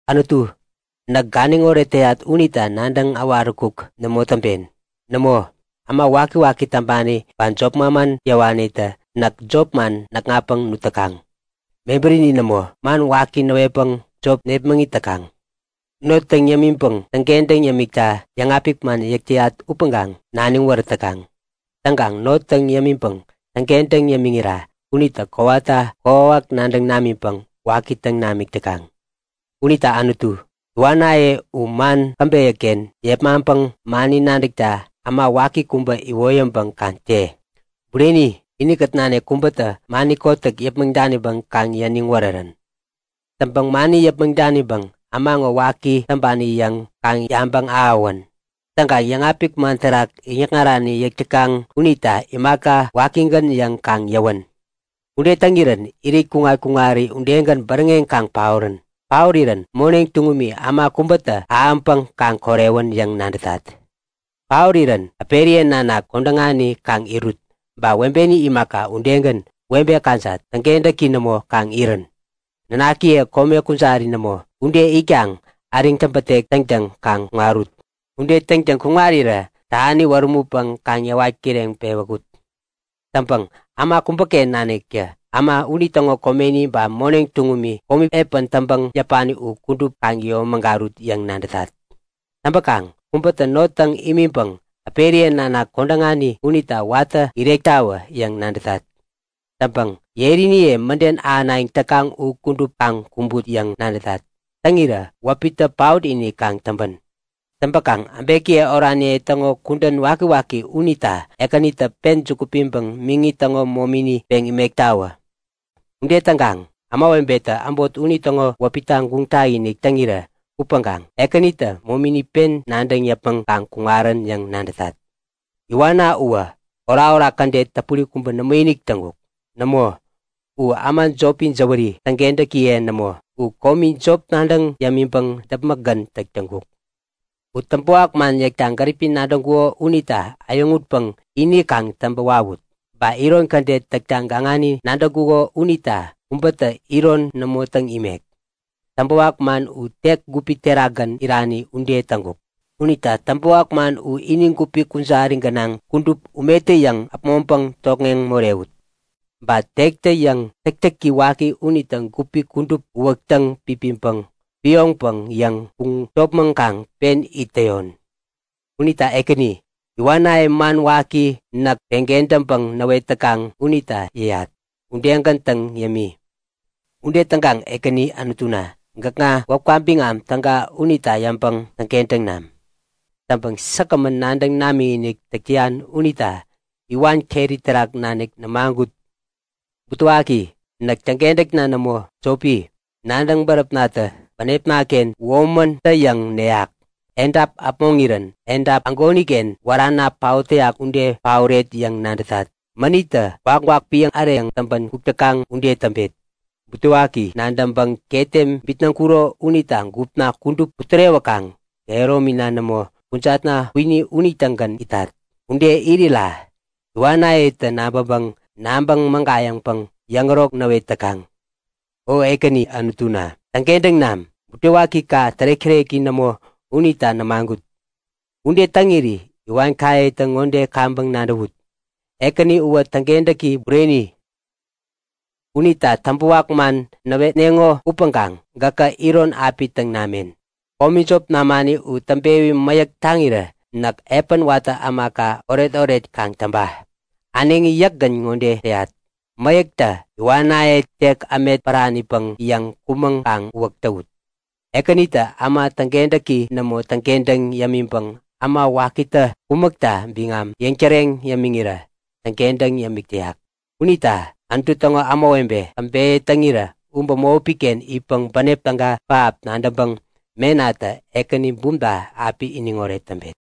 Anutu, näk ganiŋoret täyat unita nadäŋ äwaräkuk nämo täŋpen. Nämo, äma wakiwaki täŋpani ba jop manman yäwanitä näk jop man näkŋatpäŋ nut täkaŋ. Mebärini nämo, man waki näwetpäŋ jop nepmäŋit täkaŋ. Not täŋ yämiŋpäŋ täŋkentäŋ yämikta yäŋapik man yäk täyat upäŋkaŋ naniŋ wärät täkaŋ. Täŋkaŋ not täŋ yämiŋpäŋ täŋkentäŋ yämiŋira unitä kowata kokwawak nadäŋ namiŋpäŋ waki täŋ namik täkaŋ. Unita Anutu, iwannaye u man käbeyäken yepmaŋpäŋ mani nadäkta äma waki kubä iwoyäŋpäŋ kaŋ te! Bureni, inikät nanik kubätä mani kotäk yäpmäŋ daniŋpäŋ kaŋ iniŋ wärärän. Täŋpäŋ mani yäpmäŋ daniŋpäŋ äma ŋo waki täŋpani yäŋ kaŋ yabäŋ-ahäwän. Täŋkaŋ yäŋapik man terak yäŋikŋarani yäk täkaŋ unita imaka, wakigän yäŋ kaŋ yäwän. Ude täŋirän irit kuŋat-kuŋari udegän bäräŋeŋ kaŋ paorän! Paorirän moneŋ tuŋumi äma kubätä ahäŋpäŋ kaŋ korewän yäŋ nadätat. Paorirän äperiye nanak kodäŋani kaŋ irut. Ba webeni imaka udegän, webe kajat, täkentäki nämo kaŋ irän. Nanakiye kome kujari nämo ude itkaŋ äriŋ täpätek täŋtäŋ kaŋ kuŋarut! Ude täŋtäŋ kuŋarirä tähani wärämutpäŋ kaŋ yäwat kireŋ pewäkut! Täŋpäŋ äma kubäken naniktä äma unitäŋo komeni ba moneŋ tuŋumi komi epän täŋpäŋ yäpani u kudup kaŋ yomägarut yäŋ nadätat! Täŋpäkaŋ kubätä not täŋ imiŋpäŋ äperiye nanak kodäŋani unita watä irektawä yäŋ nadätat. Täŋpäŋ yeriniye mäden ahänayäŋ täkaŋ u kudup kaŋ kumbut yäŋ nadätat. Täŋirä wäpitä paot-inik kaŋ täŋpän! Täŋpäkaŋ äbekiye oraniye täŋo kudän wakiwaki unita Ekänitä pen juku piŋpäŋ miŋi täŋo momini peŋ imektawä. Ude täŋkaŋ ämawebetä äbot unitäŋo wäpita guŋ tak-inik täŋirä upäŋkaŋ Ekänitä momini pen nadäŋ yäpmäŋ kaŋ kuŋarän yäŋ nadätat. Iwanna uwä orakorak kädet täpuri kubä nämoinik täŋkuk. Nämo, u äma jopi jäwäri, täŋkentäkiye nämo u komi jop nadäŋ yämiŋpäŋ däpmäkgän täk täŋkuk. U täŋpäwak man yäkta gäripi nadäŋkuko unita äyäŋutpäŋ ini kaŋ täŋpä wawut. Ba iron kädet täkta gaŋani nadäŋkuko unita kubätä iron nämo täŋ imek. Täŋpäwak man u tek gupi terakgän irani ude täŋkuk. Unita täŋpäwak man u ini gupi kujari gänaŋ kudup umetä-yäŋ äpmoŋpäŋ tokŋeŋ morewut! Ba tektä-yäŋ täktäki waki unitä gupi kudup uwäk täŋpipiŋpäŋ, pioŋpäŋ yäŋ puŋ topmäŋkaŋ pen it täyon. Unita Ekäni, iwanaye man waki näk peŋkentäŋpäŋ näwet täkaŋ unita yäyat udegän täŋ yämi. Ude täŋkaŋ Ekäni Anutuna gäkŋa wäpka biŋam täga unita yäŋpäŋ täŋkentäŋ nam. Täŋpäŋ säkgämän nadäŋ namikinik täk täyan unita iwan keri terak nanik nämagut. Butewaki! Näk täŋkentäkna nämo, jopi. Nadäŋ-bäräpnatä bänepnaken komi, womäntä yäŋ neyak. Edap äpmoŋirän edap ägoniken wärana paot täyak ude paoret yäŋ nadätat. Mänittä gwakgwak piäŋ äreyäŋ täŋpän kuk täkaŋ ude täŋpet. Butewaki nadäŋpäŋ ketem bitnäŋkuro unita gupna kudup putärewäkaŋ kehäromina nämo, kujatna kwini unitägän itat. Ude irira iwanayetä nabäŋkaŋ nabäŋ mägayäŋpäŋ yäŋärok näwet täkaŋ. O Ekäni Anutuna, täŋkentäŋ nam! Butewakika tärek-täreki nämo unita nämagut. Ude täŋiri iwanayetä ŋode kaŋpäŋ nadäwut; Ekäni uwä täŋkentäki bureni. Unitä täŋpäwak man näwetneŋo upäŋkaŋ gäkä iron api täŋ namen. Komi jop namani u täŋpewi mäyäk taŋirä näk epän watä ämaka oretoret kaŋ täŋpa. Äneŋi yäkgän ŋode täyat; Mäyäktä iwanaye tek ämet päranipäŋ yäŋ kumän kaŋ uwäk täwut! Ekänitä äma täŋkentäki nämo itkentäŋ yämiŋpäŋ äma wakitä kumäkta biŋam yäŋtäreŋ yämiŋirä täŋkentäŋ yämik täyak. Unita, Anutu täŋo ämawebe käbeyä täŋirä u bämopiken itpäŋ bänep täga pähap nadäŋpäŋ menatä Ekäni bumta api iniŋoret täŋpet.